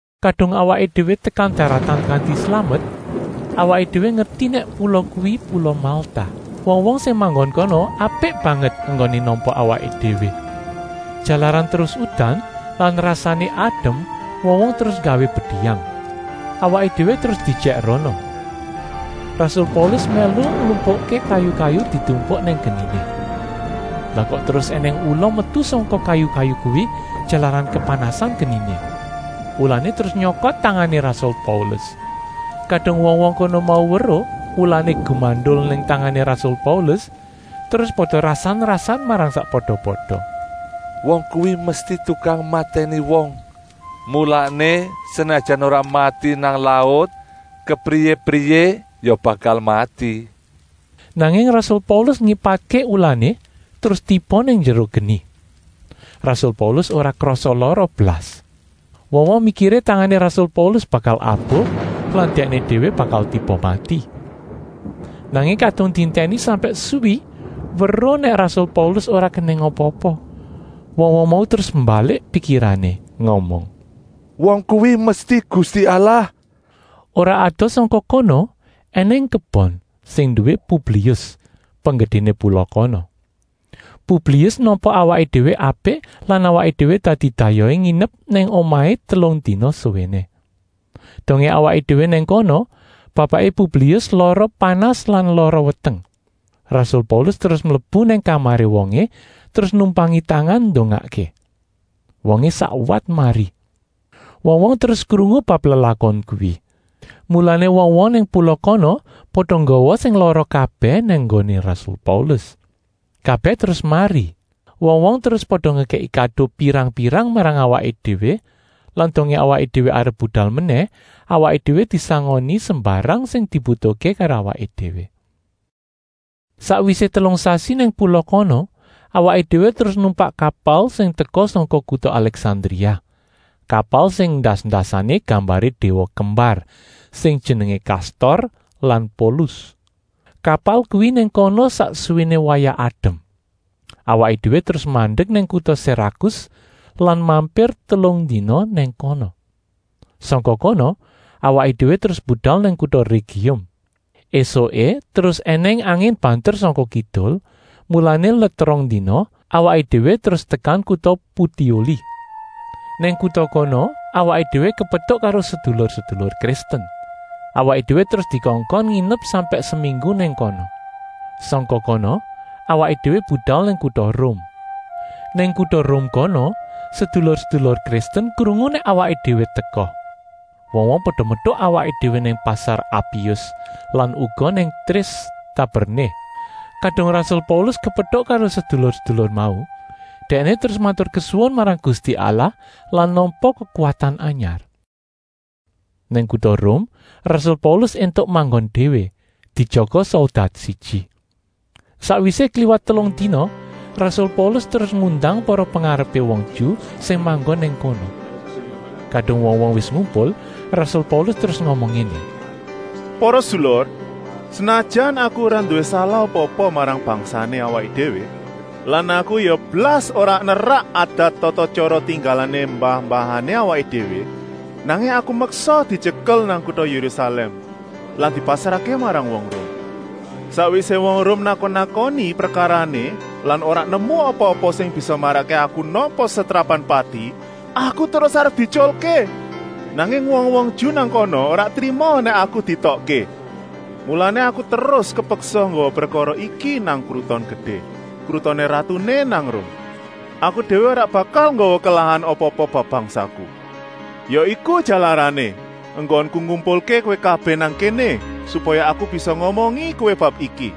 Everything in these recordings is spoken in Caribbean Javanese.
Kadung awaké déwé tekan daratan kanti slamet, awaké déwé ngerti nèk pula kuwi pula Malta. Wong-wong sing manggon kono apik banget enggoné nampa awaké déwé. Jalaran terus udan lan rasané adem wong-wong terus nggawé bediyang. Awaké déwé terus diejèk rono. Rasul Paulus mèlu nglumpukké kayu-kayu ditumpuk nang geniné. Lah kok terus ènèng ula metu sangka kayu-kayu kuwi, jalaran kepanasen geniné. Ulané terus nyokot tangané rasul Paulus. Kadung wong-wong kono mau weruh ulané gumandul nang tangané rasul Paulus, terus pada rasan-rasan marang sakpada-pada: “Wong kuwi mesti tukang matèni wong, mulané senajan ora mati nang laut kepriyé-priyé ya bakal mati.” Nanging rasul Paulus ngipatké ulané terus tiba nang njero geni. Rasul Paulus ora krasa lara blas. Wong-wong mikiré tangané rasul Paulus bakal abuh lan dèkné déwé bakal tiba mati. Nanging kadung dientèni sampèk suwi weruh nèk rasul Paulus ora kenèng apa-apa, wong-wong mau terus mbalik pikirané, ngomong: “Wong kuwi mesti gusti allah!” Ora adoh sangka kono ènèng kebon, sing nduwé Publius, penggedéné pula kono. Publius nampa awaké déwé apik lan awaké déwé dadi dayohé nginep nang omahé telung dina suwéné. Dongé awaké déwé nang kono bapaké Publius lara panas lan lara weteng. Rasul Paulus terus mlebu nang kamaré wongé terus numpangi tangan ndongakké. Wongé sakwat mari. Wong-wong terus krungu bab lelakon kuwi, mulané wong-wong nang pula kono pada nggawa sing lara kabèh nang nggoné rasul Paulus. Kabèh terus mari. Wong-wong terus pada ngekèki kado pirang-pirang marang awaké déwé lan dongé awaké déwé arep budal menèh, awaké déwé disangoni sembarang sing dibutuhké karo awaké déwé. Sakwisé telung sasi nang pula kono, awaké déwé terus numpak kapal sing teka sangka kuta Alèksandria, kapal sing endas-endasané gambaré déwa kembar sing jenengé Kastor lan Polus. Kapal kuwi nang kono sak suwéné wayah adem. Awaké déwé terus mandek nang kuta Serakus lan mampir telung dina nang kono. Sangka kono awaké déwé terus budal nang kuta Régium. Esuké terus ènèng angin banter sangka kidul, mulané let rong dina awaké déwé terus tekan kuta Putioli. Nang kuta kono awaké déwé kepetuk karo sedulur-sedulur Kristen. Awaké déwé terus dikongkon nginep sampèk seminggu nang kono. Sangka kono awaké déwé budal nang kuta Rum. Nang kuta Rum kono sedulur-sedulur Kristen krungu nèk awaké déwé teka. Wong-wong pada metuk awaké déwé nang Pasar Apius lan uga nang Trés Taberné. Kadung rasul Paulus kepetuk karo sedulur-sedulur mau, dèkné terus maturkesuwun marang Gusti Allah lan nampa kekuwatan anyar. Nang kuta Rum rasul Paulus éntuk manggon déwé, dijaga soldat siji. Sakwisé kliwat telung dina rasul Paulus terus ngundang para pengarepé wong Ju sing manggon nang kono. Kadung wong-wong wis ngumpul, rasul Paulus terus ngomong ngéné: “Para sedulur, senajan aku ora nduwé salah apa-apa marang bangsané awaké déwé lan aku ya blas ora nerak adat tata-tyara tinggalané mbah-mbahané awaké déwé, nanging aku meksa dityekel nang kuta Yérusalèm lan dipasrahké marang wong Rum. Sakwisé wong Rum nakon-nakoni prekarané lan ora nemu apa-apa sing bisa marakké aku nampa setrapan pati, aku terus arep dietyulké. Nanging wong-wong Ju nang kana ora trima nèk aku dietokké, mulané aku terus kepeksa nggawa prekara iki nang kruton gedé, krutoné ratuné nang Rum. Aku déwé ora bakal nggawa kelahan apa-apa bab bangsaku. Ya iku jalarané enggonku ngumpulké kowé kabèh nang kéné, supaya aku bisa ngomongi kowé bab iki.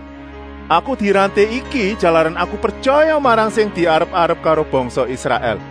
Aku diranté iki jalaran aku pretyaya marang sing diarep-arep karo bangsa Israèl.”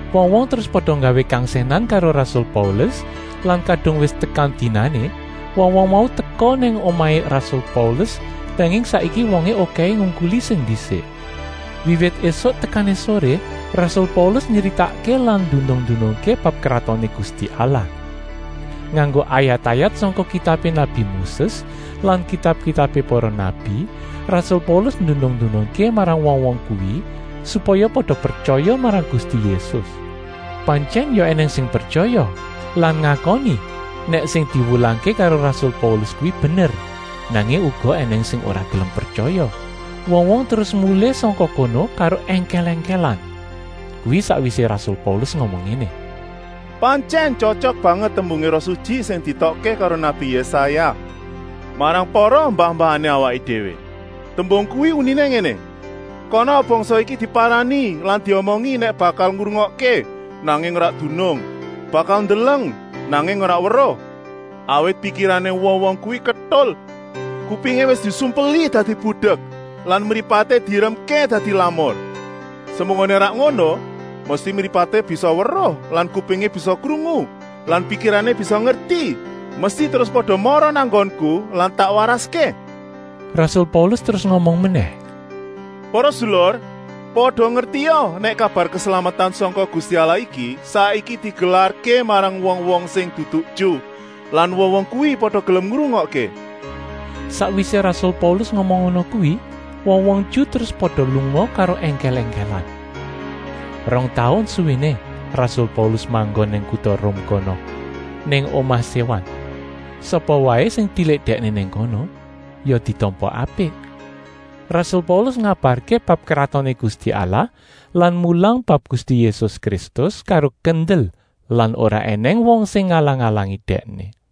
Wong-wong terus pada nggawé kangsènan karo rasul Paulus lan kadung wis tekan dinané wong-wong mau teka nang omahé rasul Paulus, nanging saiki wongé okèhé ngungkuli sing ndisik. Wiwit ésuk tekané soré rasul Paulus nyritakké lan ndunung-ndunungké bab Kratoné Gusti Allah. Nganggo ayat-ayat sangka kitabé nabi Moses lan kitab-kitabé para nabi, rasul Paulus ndunung-ndunungké marang wong-wong kuwi, supaya pada pretyaya marang Gusti Yésus. Pantyèn ya ènèng sing pretyaya lan ngakoni nèk sing diwulangké karo rasul Paulus kuwi bener, nanging uga ènèng sing ora gelem pretyaya. Wong-wong terus mulih sangka kono karo èngkèl-èngkèlan. Kuwi sakwisé rasul Paulus ngomong ngéné: “Pantyèn tyotyok banget tembungé Roh Sutyi sing dietokké karo nabi Yésaya marang para mbah-mbahané awaké déwé. Tembung kuwi uniné ngéné: ‘Kana bangsa iki diparani lan diomongi nèk bakal ngrungokké, nanging ora dunung, bakal ndeleng, nanging ora weruh. Awit pikirané wong-wong kuwi ketul, kupingé wis disumpeli dadi budek lan mripaté dieremké dadi lamur. Semunggoné ora ngono, mesti mripaté bisa weruh lan kupingé bisa krungu lan pikirané bisa ngerti, mesti terus pada mara nang nggonku lan tak waraské!’” Rasul Paulus terus ngomong menèh: “Para sedulur, pada ngertia nèk kabar keslametan sangka Gusti Allah iki saiki digelarké marang wong-wong sing dudu Ju lan wong-wong kuwi pada gelem ngrungokké.” Sakwisé rasul Paulus ngomong ngono kuwi, wong-wong Ju terus pada lunga karo èngkèl-èngkèlan. Rong taun suwéné rasul Paulus manggon nang kuta Rum kono, nang omah séwan. Sapa waé sing tilik dèkné nang kono ya ditampa apik. Rasul Paulus ngabarké bab Kratoné Gusti Allah lan mulang bab Gusti Yésus Kristus karo kendel lan ora ènèng wong sing ngalang-alangi dèkné.